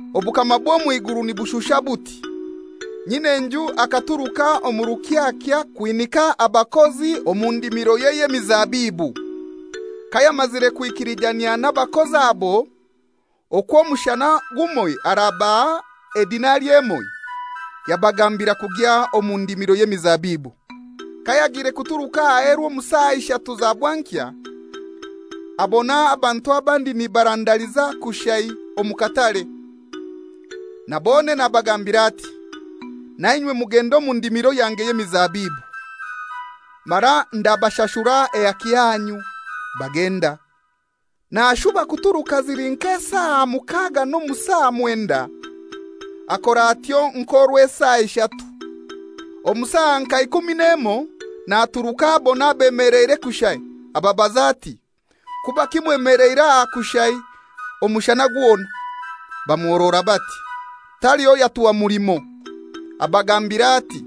«Obukama bw'omw'iguru nibushusha buti: Nyin'enju akaturuka omu rukyakya kwinika abakozi omu omu ndimiroye y'emizabibu. Kayamazire kwikilijanyia n'abakozi abo okwo omushana gumoi arabaha edinari emoi, yabagambira kugya omu ndimiro y'emizabibu. Kayagiire kuturuka aheru omu saa ishatu za bwankya, abona abantu abandi nibarandaliza kushai omu katare. Na bonene abagambira ati, ‹Nainywe mugende omu ndimiro yange y'emizabibu, mara ndabashashura ehaki yanyu.› Bagenda. Nashuba kuturuka zili nk'esaa mukaga n'omu saa mwenda, akora atyo nk'orwesaa ishatu. Omu saa nka ikumi n'emoi naturuka abona abemeleire kushai, ababaza ati, ‹Kubaki mwemeleire aha kushai omushana gwona?› Bamuhorora bati, ‹Taliho yatuha mulimo!› Abagambira ati,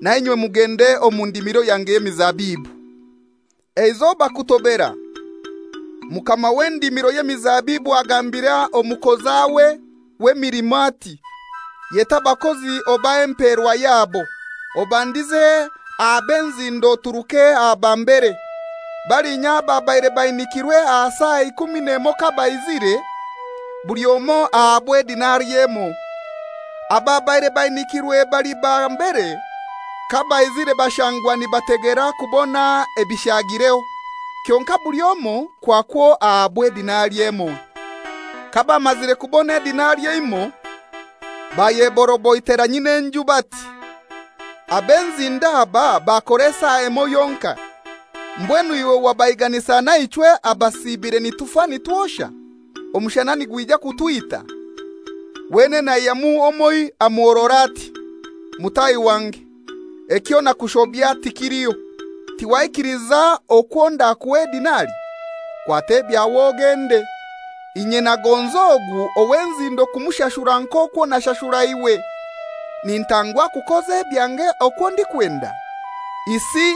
‹Na inywe mugende omu ndimiro yange y'emizabibu.› Eizoba kutobera, mukama w'endimiro y'emizabibu agambira omukozawe w'emilimo ati, ‹Yeta abakozi obahe emperwa yabo, obandize aha b'enzindo oturuke aha ba mbere.› Balinya ababaire bainikirwe aha saa ikumi n'emoi kabaizire, buli omoi ahabwa edinari emoi. Ababaire bainikirwe bali ba mbere kabaizire bashangwa nibategera kubona ebishagireho; kyonkai buli omoi kwakwo ahabwa edinari emoi. Kabamazire kubona edinari emoi bayeboroboitera nyin'enju bati, ‹Ab'enzindo aba bakora esaa emoi yonkai, mbwenu iwe wabaiganisa naichwe abasiibire nitufa nitwosha, omushana nigwija kutwita.› Wenene aihyamu omoi amuhorora ati, ‹Mutahi wange, ekyo nakushobya tikiliho; tiwaikiliza okwo ndakuha edinari? Kwata ebyawe ogende; inye nagonza ogu ow'enzindo kumushashura nk'okwo nashashura iwe. Nintangwa kukoza ebyange okwo ndikwenda? Isi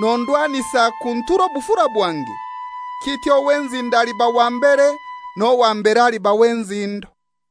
nondwanisa kuntura obufura bwange?› Kityo ow'enzindo aliba wa mbere n'owa mbere aliba w'enzindo.»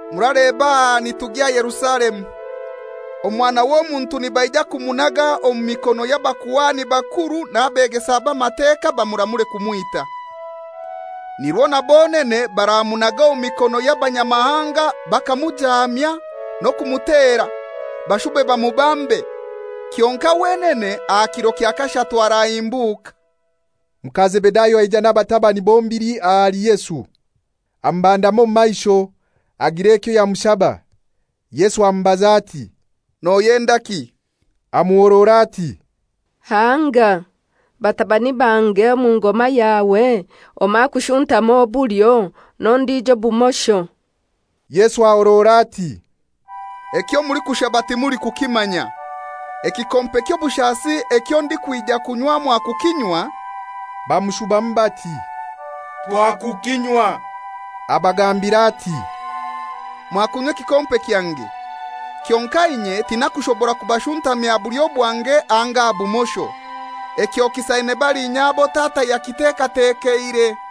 «Muraleba aha nitugya Yerusalemu; Omwana w'Omuntu nibaija kumunaga omu mikono y'abakuhani bakuru n'abegesa b'Amateka bamuramure kumwita. Nirwo na bonene baramunaga omu mikono y'abanyamahanga bakamujaamya n'okumutera, bashube bamubambe. Kyonkai wenene aha kiro kya kashatu arahimbuka.» Muka Zebedayo aija n'abatabani bombili ahali Yesu, amubandama omu maisho agira ekyo yamushaba. Yesu amubaza ati, «Noyendaki?» Amuhorora ati, «Hanga, batabani bange omu ngoma yawe omoi akushuntame obulyo n'ondijo obumosho.» Yesu ahorora ati, «Ekyo mulikushaba timulikukimanya. Ekikompe ky'obushasi ekyo ndikwija kunywa mwakukinywa?» Bamushubamu bati, «Twakukinywa.» Abagambira ati, «Mwakunywa ekikompe kyange, kyonkai inye tinakushobora kubashuntamya aha bulyo bwange anga aha bumosho. Ekyo kisaine balinya abo Tata yakitekatekeire.»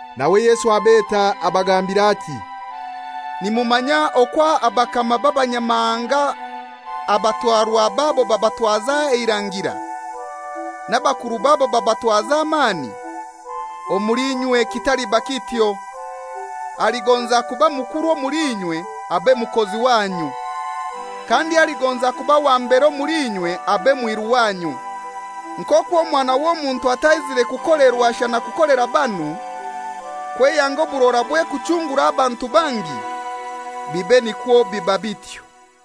Nawe Yesu abeta abagambira ati, «Nimumanya okwo abakama b'abanyamahanga abatwarwa babo babatwaza eirangira, n'abakuru babo babatwaza amani. Omuli inywe kitaliba kityo. Aligonza kuba mukuru omuli inywe abe mukozi wanyu. Kandi aligonza kuba wa mbere omuli inywe abe mwiru wanyu. Nk'okwo Omwana w'Omuntu ataizire kukolerwa shana kukolera banu, kweyanga oburorabwe kuchungura abantu bangi, bibe nikwo biba bityo.»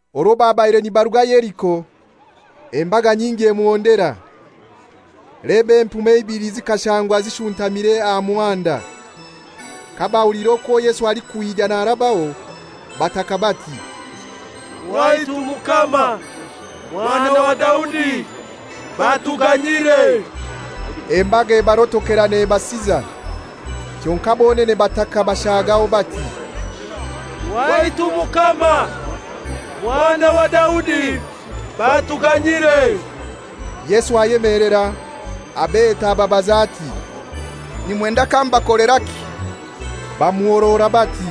Orwo babaire nibaruga Yeriko, embaga nyingi emuhondera. Leba empume ibili zikashangwa zishuntamire aha muhanda. Kabahuliire okwo Yesu alikwija narabaho, bataka bati, «Waitu Mukama, Mwana wa Daudi batuganyire!» Embaga ebarotokera nebasiza. Kyonkai bonene bataka bashagaho, bati, «Waitu Mukama, Mwana wa Daudi batuganyire!» Yesu ayemelera, abeta ababaza ati, «Nimwenda kambakoleraki?» Bamuhorora bati,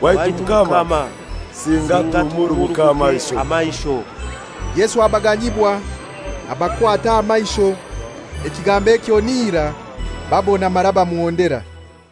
«Waitu Mukama, singa tuhumuruguke amaisho.» Yesu abaganyibwa, abakwata aha maisho, ekigambo ekyo n'irai babona mara bamuhondera.